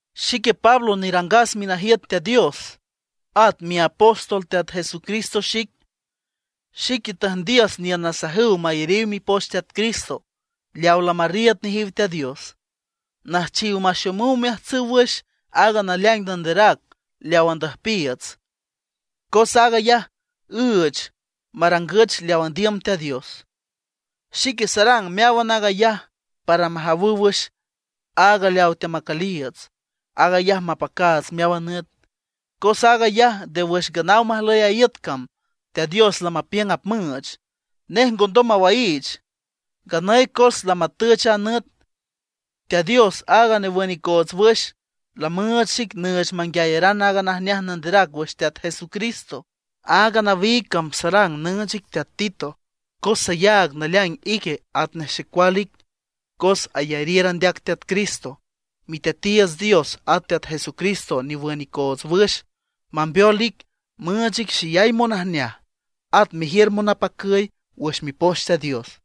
Xique Pablo nerangas minajiüt Teat Dios, at miapóstol Teat Jesucristo xic. Xique tüjndiüs niün nasajüw mayariw mipoch Teat Cristo leaw lamarriiüd nejiw Teat Dios; nüjchiw maxomüw omeajtsüw wüx aaga naleaing nanderac leaw andüjpiiüts, cos aag ayaj üüch marangüch leaw andiüm Teat Dios. Xique sarang meáwan aag ayaj para majawüw wüx aaga leawa teamacüliiüts, aag ayaj mapacaats meáwan nüt. Cos aag ayaj nde wüx nganaw majlüy a iüt cam Teat Dios lamapiüng apmüüch; nej ngondom mawaiich. Nganüy cos lamatüch a nüt, Teat Dios aaga newün icoots wüx, lamüüch xic nüüch manguiayaran aaga najneaj nanderac wüx Teat Jesucristo. Aaga nawiig cam sarang nüüch ic teat Tito, cos sayaag naleaing ique atnej xecual ic, cos ayariür andeac Teat Cristo. Miteatiiüts Dios at Teat Jesucristo newün icoots wüx, mambeol ic, müüch ic xeyay monajneaj, at mejiür monapacüy wüx Mipoch Teat Dios.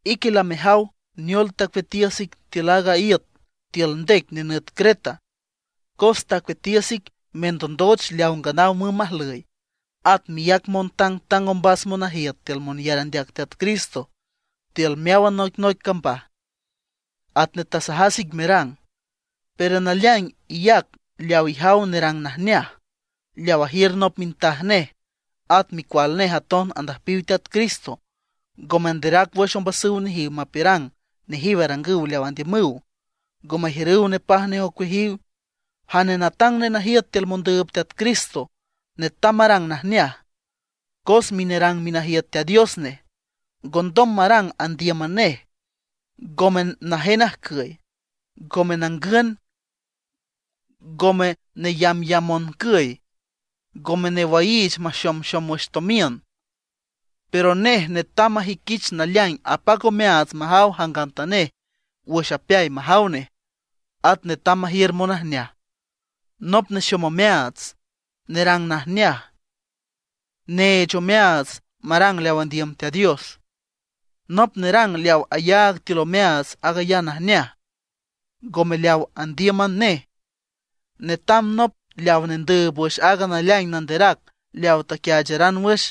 Ique lamejaw neol tacueatiüs ic tiül aaga iüt tiül ndec nenüt Creta, cos tacueatiüs ic mendondoch leaw nganaw mümb majlüy, at meyac montangtang ombas monajiüt tiül monyar andeac Teat Cristo tiül meáwan noicnoic cambaj, atnej tasajas ic merang. Pero naleaing iyac leaw ijaw nerang najneaj, leaw ajiür nop minjtaj nej, at micual nej aton andüjpiw Teat Cristo, ngo manderac wüx ombasüw nejiw mapiürang nejiw arangüw leaw andiümüw, ngo majiürüw nepaj nej ocueajiw. Jane natang nenajiüt tiül mondüüb Teat Cristo netam marang najneaj, cos minerang minajiüt Teat Dios nej. Ngondom marang andíüman nej, ngome najen ajcüy, ngome nangün, ngome neyambyamb moncüy, ngome newaiich maxomxom tomiün. Pero nej netam majüiquich naleaing apac omeaats majaw jangantanej wüx apeay majaw nej. At netam majiür monajneaj, nop nexom omeaats, nerang najneaj, neech omeaats marang leaw andiüm Teat Dios, nop nerang leaw ayaag tiül omeaats aag ayaj najneaj, ngome leaw andíüman nej. Netam nop leaw nendüüb wüx aaga naleaing nanderac leawa taquiaacharan wüx,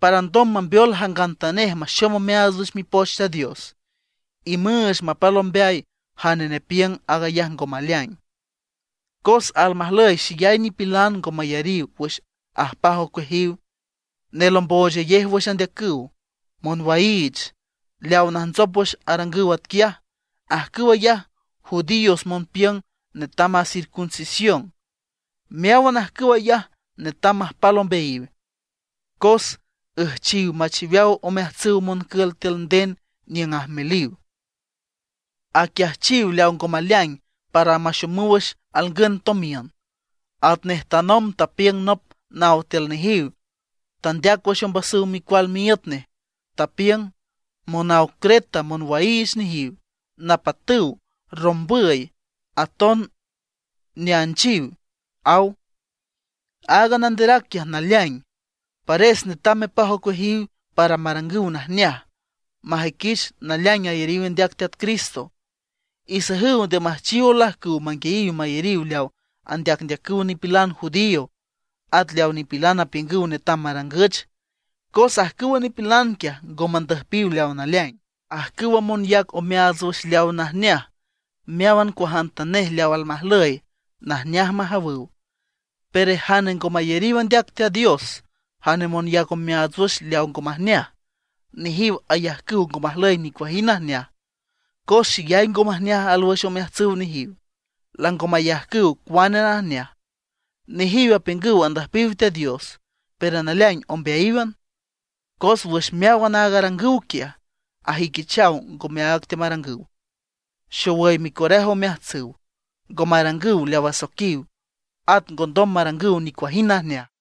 para alndom mambeol jangantanej maxom omeaats wüx Mipoch Teat Dios, y müüch mapal ombeay jane nepiüng aag ayaj ngo maleaing. Cos almajlüy xeyay nipilan ngo mayariw wüx ajpaj ocueajiw, nelomboochayej wüx andeacüw, monwaiich. Leaw najntsop wüx arangüw atquiaj, ajcüw ayaj judíos monpiüng netam aaga circuncisión. Meáwan ajcüw ayaj netam majpal ombeayiw, cos üjchiw machiweaw omeajtsüw moncül tiül nden niüng ajmeliw. Aquiajchiw leaw ngo maleaing para maxomüw wüx alngün tomiün. Atnej tanomb tapiüng nop naw tiül nejiw, tandeac wüx ombasüw micual miíüt nej. Tapiüng: “Monaw Creta monwaiich nejiw, napatüw, rombüy, aton neanchiw”, aw. Aaga nanderac quiaj naleaing. Pares netam mepaj ocueajiw para marangüw najneaj, majüiquich naleaing ayariw andeac Teat Cristo. Isajüw nde müjchiw olajcüw manguiayiw mayariw leaw andeacndeacüw nipilan judío, at leawa nipilan apiüngüw netam marangüch, cos ajcüwa nipilan quiaj ngo mandüjpiw leaw naleaing. Ajcüwa monyac omeaats wüx leawa najneaj, meáwan cuajantanej leaw almajlüy, najneaj majawüw. Pero jane ngo mayariw andeac Teat Dios, jane monyac omeaats wüx leaw ngo majneaj, nejiw ayajcüw ngo majlüy nicuajind najneaj; cos xeyay ngo majneaj alwüx omeajtsüw nejiw, lango mayajcüw cuane najneaj. Nejiw apiüngüw andüjpiw Teat Dios, pero naleaing ombeayíwan; cos wüx meáwan aaga arangüw quiaj, ajüiquichaw ngome áag teamarangüw. Xowüy micoraje omeajtsüw, ngo marangüw leaw asoiquiw, at ngondom marangüw nicuajind najneaj.